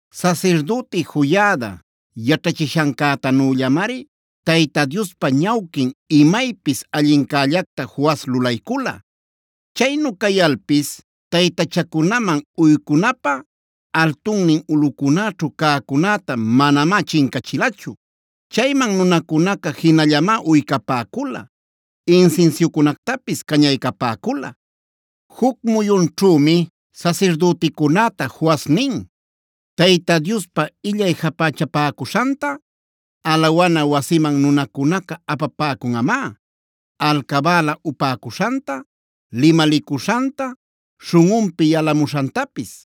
Sasirdüti Joiada yaćhachishancätanüllamari Tayta Diospa ñawquin imaypis allincällacta Joas lulaycula. Chaynu cayalpis taytachacunaman uycunapä altunnin ulꞌucunäćhu cäcunäta manamá chincachilachu. Chayman nunacunaca jinallamá uycapäcula, insinsiucunactapis cañaycapäcula. Juc muyunćhümi sasirdüticunäta Joas nin: “Tayta Diospa illay japächapäcuśhanta alawana wasiman nunacunaca apapäcamunꞌamá: alcabäla upäcuśhanta, limalicuśhanta, śhunꞌunpi yalamuśhantapis.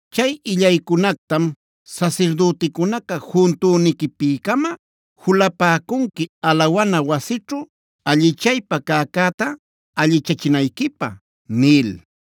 Chay illaycunactam sasirdüticunaca juntüniquipi-cama julapäcunqui alawana wasićhu allichaypä cäcäta allichachinayquipä” nil.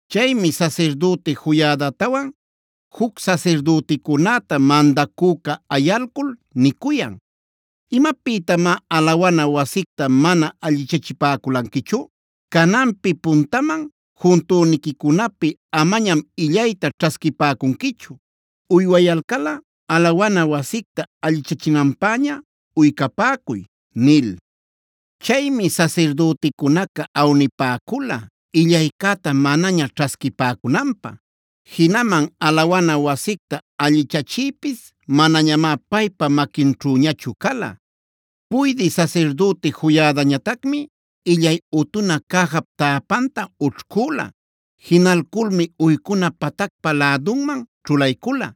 Chaymi sasirdüti Joiadatawan juc sasirdüticunäta mandacüca ayalcul nicuyan: “¿¡Imapïtamá alawana wasicta mana allichachipäculanquichu!? Cananpi puntaman juntüniquicunapi amañam illayta ćhasquipäcunquichu; uywayalcalꞌa alawana wasicta allichachinanpäña uycapäcuy” nil. Chaymi sasirdüticunaca awnipäcula illaycäta manaña ćhasquipäcunanpä; jinaman alawana wasicta allichachiypis manañamá paypa maquinćhüñachu cala. Puydï sasirdüti Joiadañatacmi illay utuna cäjap täpanta ućhcüla. Jinalculmi uycuna patacpa lädunman ćhulaycula.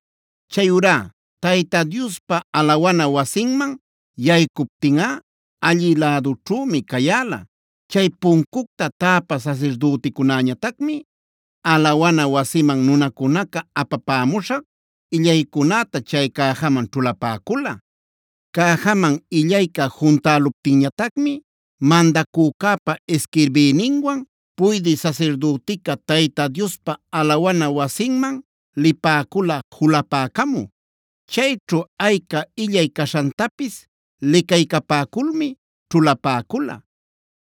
Chayurá Tayta Diospa alawana wasinman yaycuptinꞌa allï lädućhümi cayäla. Chay puncucta täpä sasirdüticunäñatacmi alawana wasiman nunacunaca apapämuśhan illaycunäta chay cäjaman ćhulapäcula. Cäjaman illayca juntäluptinñatacmi mandacücäpa isquirbïninwan puydï sasirdütica Tayta Diospa alawana wasinman lipäcula julapäcamü. Chayćhu ayca illay caśhantapis licaycapäculmi ćhulapäcula.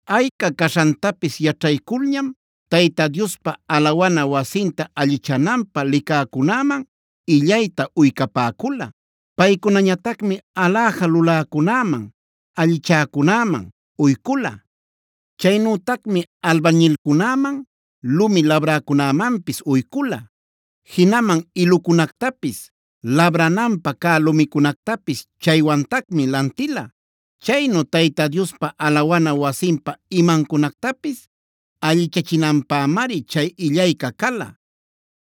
Ayca caśhantapis yaćhayculñam Tayta Diospa alawana wasinta allichananpä licäcunäman illayta uycapäcula. Paycunañatacmi aläja luläcunäman, allichäcunäman uycula. Chaynütacmi albañilcunäman, lumi labräcunämanpis uycula. Jinaman ilucunactapis, labrananpä cä lumicunactapis chaywantacmi lantila. Chaynu Tayta Diospa alawana wasinpa imancunactapis allichachinanpämari chay illayca cala.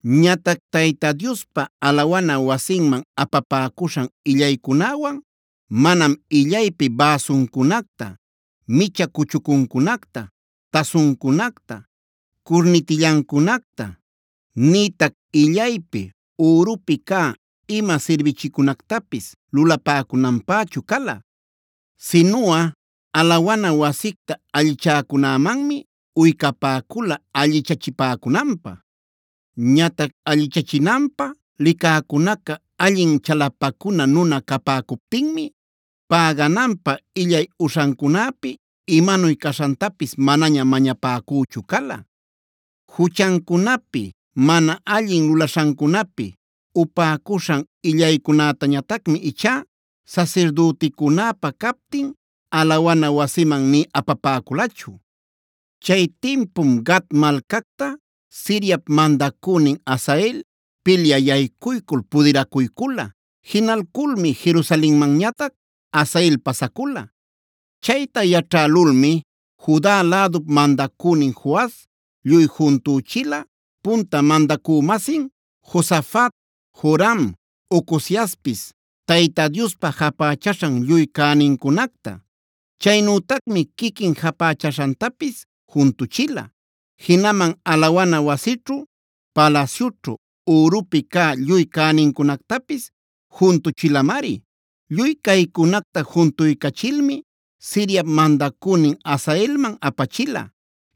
Ñatac Tayta Diospa alawana wasinman apapäcuśhan illaycunäwan manam illaypi bäsuncunacta, micha cuchucuncunacta, tasuncunacta, curnitillancunacta, nïtac illaypi ürupi cä ima sirbichicunactapis lulapäcunanpächu cala. Sinuꞌa alawana wasicta allichäcunämanmi uycapäcula allichachipäcunanpä. Ñatac allichachinanpä licäcunaca allin chalapacuna nuna capäcuptinmi pägananpä illay uśhancunäpi imanuy caśhantapis manaña mañapäcüchu cala. Juchancunapi, mana allin lulaśhancunapi upäcuśhan illaycunätañatacmi ichá sasirdüticunäpa captin alawana wasimanb nï apapäculachu. Chay tinpum Gat malcacta Siriap mandacünin Hazael pilyä yaycuycul pudiracuycula. Jinalculmi Jerusalenmanñatac Hazael pasacula. Chayta yaćhälulmi Juda lädup mandacünin Joas lluy juntüchila punta mandacü-masin Josafat, Joram, Ocoziaspis Tayta Diospa japächaśhan lluy cänincunacta. Chaynütacmi quiquin japächaśhantapis juntuchila. Jinaman alawana wasićhu, palasyućhu ürupi cä lluy cänincunactapis juntuchilamari. Lluy caycunacta juntuycachilmi Siriap mandacünin Hazaelman apachila.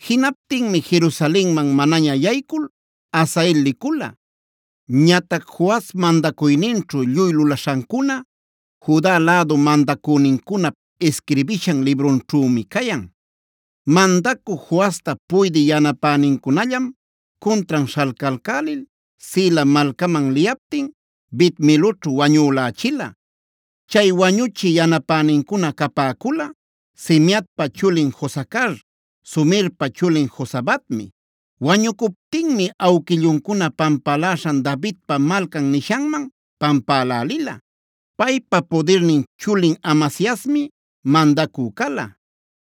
Jinaptinmi Jerusalenman manaña yaycul Hazael licula. Ñatac Joas mandacuyninćhu lluy lulaśhancuna Juda lädu mandacünincunap isquirbishan librunćhümi cayan. Mandacü Joasta puydï yanapänincunallam cuntran śhalcalcälil Sila malcaman liyaptin Bet-miloćhu wañülächila. Chay wañuchï yanapänincuna capäcula: Simeatpa chulin Josacar, Somerpa chulin Jozabadmi. Wañucuptinmi awquilluncuna pampaläśhan Davidpa Malcan nishanman pampälälila. Paypa pudirnin chulin Amasiasmi mandacü cala.